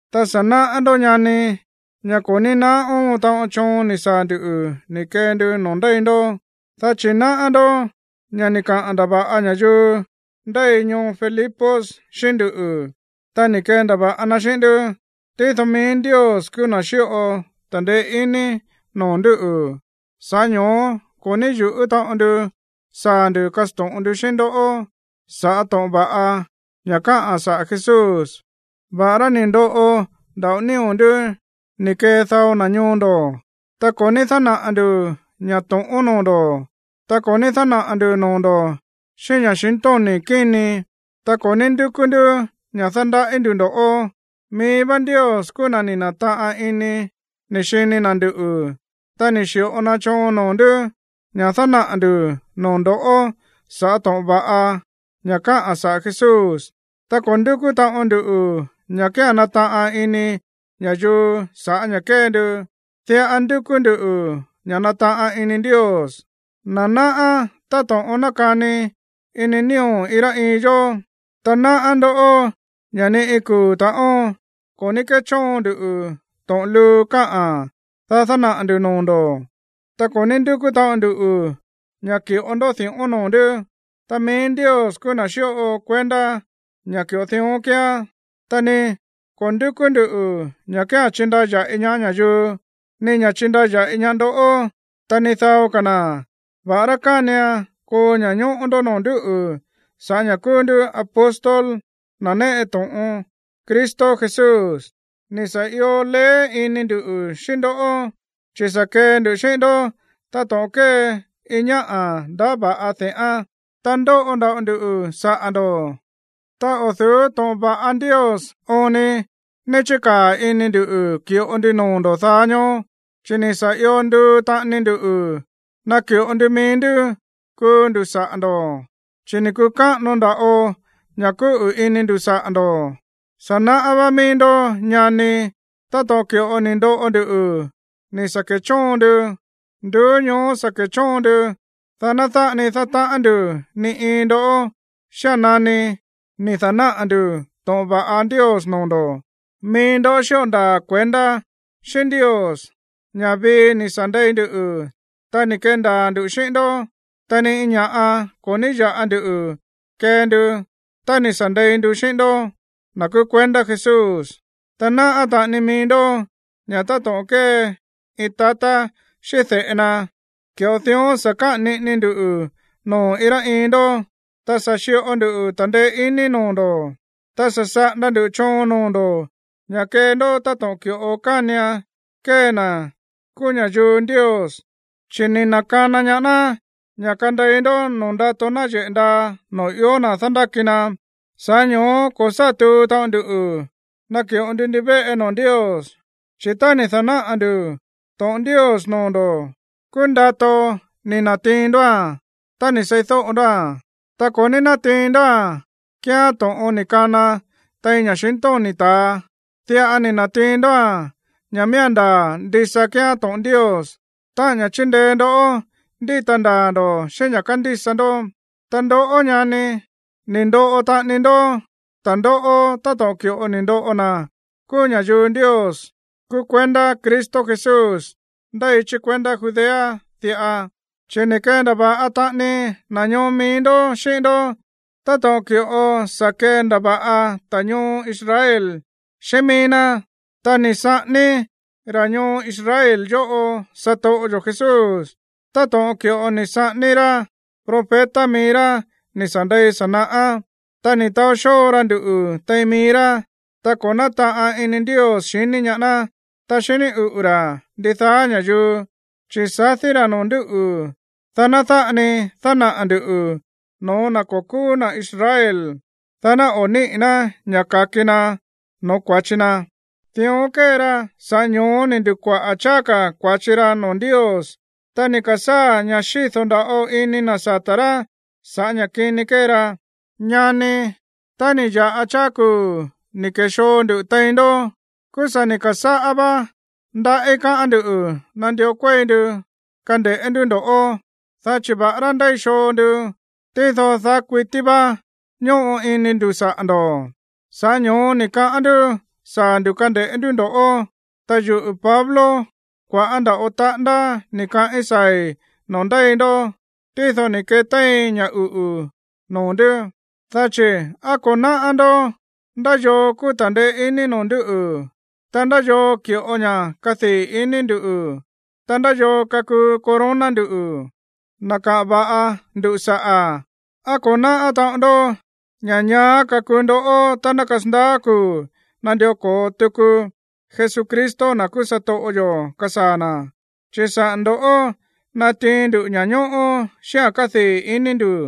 Ta sa̱ náꞌá ndó, ñani, ña̱ ko̱ ní naá óon taꞌon choon ni̱ saa̱ ndu̱ ni̱ kee ndu noo̱ ndéi ndó. Dá chi̱ náꞌá ndó ña̱ ni̱ kaꞌa̱n ndava̱ꞌa ña̱yuu ndéi ñoo Filipos xíꞌín nduꞌu̱, ta ni̱ kendava̱ꞌa na xíꞌín ndú. Tído mií Ndios kúú na̱ ni̱ xi̱ꞌo ta̱ndeé iní noo̱ ndúꞌu̱, sa̱ꞌá ño̱ó ko̱ ní yuꞌú taꞌon ndu saa̱ ndu̱ kasto̱ꞌon ndu xíꞌín ndó sa̱ꞌá to̱ꞌon va̱ꞌa ña̱ káꞌa̱n saꞌa̱ Jesús, va̱ꞌará ni̱ ndoꞌo nda̱ꞌo nío̱ ndú ni̱ kee dao na̱ ñoo ndo̱. Ta ko̱ ní dánaꞌa̱ ndu̱ ña̱ to̱ꞌón noo̱ ndo̱, ta ko̱ ní dánaꞌa̱ ndu̱ noo̱ ndo̱ xíꞌín ña̱xintóni̱ kíni, ta ko̱ ní ndúkú ndú ña̱ dándaꞌí ndu̱ ndo̱ꞌó. Mií vá Ndios kúú na̱ ni̱ na̱taꞌan ini ni̱ xini na̱ nduꞌu̱, ta ni̱ xi̱ꞌo na choon noo̱ ndú ña̱ dánaꞌa̱ ndu̱ noo̱ ndo̱ sa̱ꞌá to̱ꞌon va̱ꞌa ña̱ káꞌa̱n saꞌa̱ Jesús. Ta ko̱ ndúkú taꞌon nduꞌu̱ ña̱ kía̱n nataꞌan ini ña̱yuu sa̱ꞌá ña̱ kée ndu. Diꞌa ndúkú nduꞌu̱ ña̱ nataꞌan ini Ndios, na̱ náꞌá táto̱ꞌon nákani ini nío̱ iin rá iin yó. Ta náꞌá ndó ña̱ ni iin kuu̱ ta̱ꞌón ko̱ ní kéchóon nduꞌu̱ to̱ꞌon luu káꞌa̱n, dá dánaꞌa̱ ndu̱ noo̱ ndo̱. Ta ko̱ ní ndúkú taꞌon ndu ña̱ ki̱ꞌo ndó di̱ꞌón noo̱ ndú. Ta mií Ndios kúú na̱ xíꞌo kuendá ña̱ ki̱ꞌo dión kíán. Ta ni ko̱ ndúkú nduꞌu̱ ña̱ kía̱n chindaya̱ꞌi ñaá ña̱yuu, ni ña̱ chindaya̱ꞌi ñaá ndoꞌó, ta ni dao ka̱ na̱, va̱ꞌará kánian koo ña̱ñóꞌó ndó noo̱ ndúꞌu̱ sa̱ꞌá ña̱ kúú ndú apóstol, na̱ néꞌe to̱ꞌon Cristo Jesús. Ni̱ sa̱ io leé ini ndu̱ xíꞌín ndó, chi̱ sa̱ kee ndu xíꞌín ndó táto̱ꞌon kée iin ñáꞌa̱ ndaá va̱ꞌa de̱ꞌán. Ta ndóꞌo nda̱ꞌo nduꞌu̱ saꞌa̱ ndo̱. Ta o̱ du̱ú to̱ꞌon va̱ꞌa Ndios oon ni ní chíkáa̱ ini ndu̱ ki̱ꞌo ndu noo̱ ndo̱ daá ñóó, chi̱ ni̱ sa̱ io nduu taꞌani ndu naki̱ꞌo ndu mií ndú kuu ndu̱ saꞌa̱ ndo̱, chi̱ ni̱ kukáꞌano nda̱ꞌo ña̱ kúꞌu̱ ini ndu̱ saꞌa̱ ndo̱. Sa̱ náꞌá vá mií ndó, ñani, táto̱ꞌon ki̱ꞌo ni̱ ndoꞌo ndu ni̱ sa̱ kechóon ndu. Nduú ñoó sa̱ ke̱chóon nduꞌu̱, dá ná dáꞌa ni dátaꞌán ndu̱ ni iin ndoꞌó xía̱n nani ni̱ da̱náꞌa̱ ndu̱ to̱ꞌon va̱ꞌa Ndios noo̱ ndo̱. Mií ndó xíꞌo ndaa̱ kuendá xíꞌín Ndios ña̱ vii ni̱ sa̱ ndei ndu, ta ni̱ kendaa̱ ndu̱ xíꞌín ndó, ta ni iin ña̱ꞌa ko̱ ní ya̱ꞌa ndu kee ndu tá ni̱ sa̱ ndei ndu xíꞌín ndoꞌó, na̱ kúú kuendá Jesús. Ta náꞌá taꞌani mií ndó ña̱ táto̱ꞌon kée iin tatá xíꞌín de̱ꞌe na, ki̱ꞌo dión sa̱ káꞌa̱n niꞌini ndu noo̱ iin rá iin ndó, ta sa̱ xi̱ꞌo nduꞌu̱ ta̱ndeé iní noo̱ ndo̱, ta sa̱ saꞌanda ndu̱ choon noo̱ ndo̱ ña̱ kee ndó táto̱ꞌon ki̱ꞌo kánian kee na̱ kúú ña̱yuu Ndios, chi̱ ni̱ na̱kana ñaá ná ña̱ kandei ndó noo̱ ndato náyeꞌe̱ ndaa noo̱ ió na̱ dándáki na. Sa̱ꞌá ño̱ó ko̱ sá tuu taꞌon ndu náki̱ꞌo nduꞌu̱ ndivéꞌe noo̱ Ndios, chi̱ tá ni̱ da̱náꞌa̱ ndu̱ to̱ꞌon Ndios noo̱ ndo̱, kúú ndato ni̱ na̱tiin ndóa̱n tá ni̱ seídóꞌo ndóa̱n. Ta ko̱ ní nátiin ndóa̱n kíán to̱ꞌon ni̱ kana tein ña̱xintóni̱ ta̱a. Diꞌa ni̱ na̱tiin ndóa̱n ña̱ miía̱n ndaa̱ ndisa kíán to̱ꞌon Ndios, táꞌa̱n ña̱ chíndeé ndoꞌó ndíta ndaa̱ ndo̱ xíꞌín ña̱ kándísa ndó. Ta ndoꞌó, ñani, ni̱ ndoꞌo taꞌani ndó ta̱ndóꞌó táto̱ꞌon ki̱ꞌo ni̱ ndoꞌo na̱ kúú ña̱yuu Ndios kúú kuendá Cristo Jesús ndéi chí kuendá Judea diꞌa. Chi̱ ni̱ kendava̱ꞌa taꞌani na̱ ñoo mií ndó xíꞌín ndó táto̱ꞌon ki̱ꞌo sa̱ kendava̱ꞌa ta̱ ñoo Israel xíꞌín mií ná. Ta ni̱ saꞌání ta̱ ñoo Israel yóꞌo satoꞌo yo̱ Jesús táto̱ꞌon ki̱ꞌo ni̱ saꞌání rá profeta mií rá ni̱ sa̱ ndei sa̱ naꞌá. Ta ni̱ taó xóo ra nduꞌu̱ tein mií rá, ta ko̱ nátaꞌan ini Ndios xiní ñaá ná, ta xiní uꞌu̱ ra̱ ndidaá ña̱yuu, chi̱ sadí ra̱ noo̱ ndú, dá ná dáꞌa ni dánaꞌa̱ ndu̱ no̱ó na̱ ko̱ kúú na̱ Israel, dá ná o̱ níꞌi̱ ná ña̱ ka̱ki na no̱ó kua̱chi na̱. Dión kée ra, sa̱ꞌá ño̱ó ni̱ ndukuaꞌa̱ cháá ka̱ kua̱chi ra̱ noo̱ Ndios, ta ni̱ ka̱sáa̱ ña̱ xído̱ nda̱ꞌo ini na̱ sata̱ rá sa̱ꞌá ña̱ kini kée ra. Ñani, tá ni̱ ya̱ꞌa cháá kuu̱ ni̱ ke̱xoo nduꞌu̱ tein ndó, kúú sa̱ ni̱ ka̱sáꞌá vá ndaꞌí káꞌa̱n nduꞌu̱ nandió kuéi ndu kande̱ꞌé ndú ndo̱ꞌó, dá chi̱ va̱ꞌará ndéi xoo ndu, tído daá kuití vá ñóꞌo ini ndu̱ saꞌa̱ ndo̱. Sa̱ꞌá ño̱ó ni̱ kaꞌán ndú saa̱ ndu̱ kande̱ꞌé ndú ndo̱ꞌó. Ta yuꞌu̱ Pablo, kua̱ꞌá nda̱ꞌo taꞌándá ni̱ kaꞌín saa̱i̱ noo̱ ndéi ndó, tído ni̱ ketéin ña̱ uꞌu̱ noo̱ ndú. Dá chi̱ ¿á ko̱ náꞌá ndó ndá yoo kakuu ta̱ndeé iní noo̱ ndú, ta ndá yoo ki̱ꞌo ña̱ kadii̱ ini ndu̱, ta ndá yoo kakuu corona ndu̱, na̱ kaꞌa̱n va̱ꞌa ndu saꞌa̱? ¿Á ko̱ náꞌá taꞌon ndó ña̱ ñaá kakuu ndoꞌó tá ná kasandaá kuu̱ nandió ko̱o tuku Jesucristo, na̱ kúú satoꞌo yo̱, kasaa̱ na̱? Chi̱ saꞌa̱ ndo̱ꞌó natiin ndu ña̱ñóꞌó xíꞌa̱n kadii̱ iní ndu̱.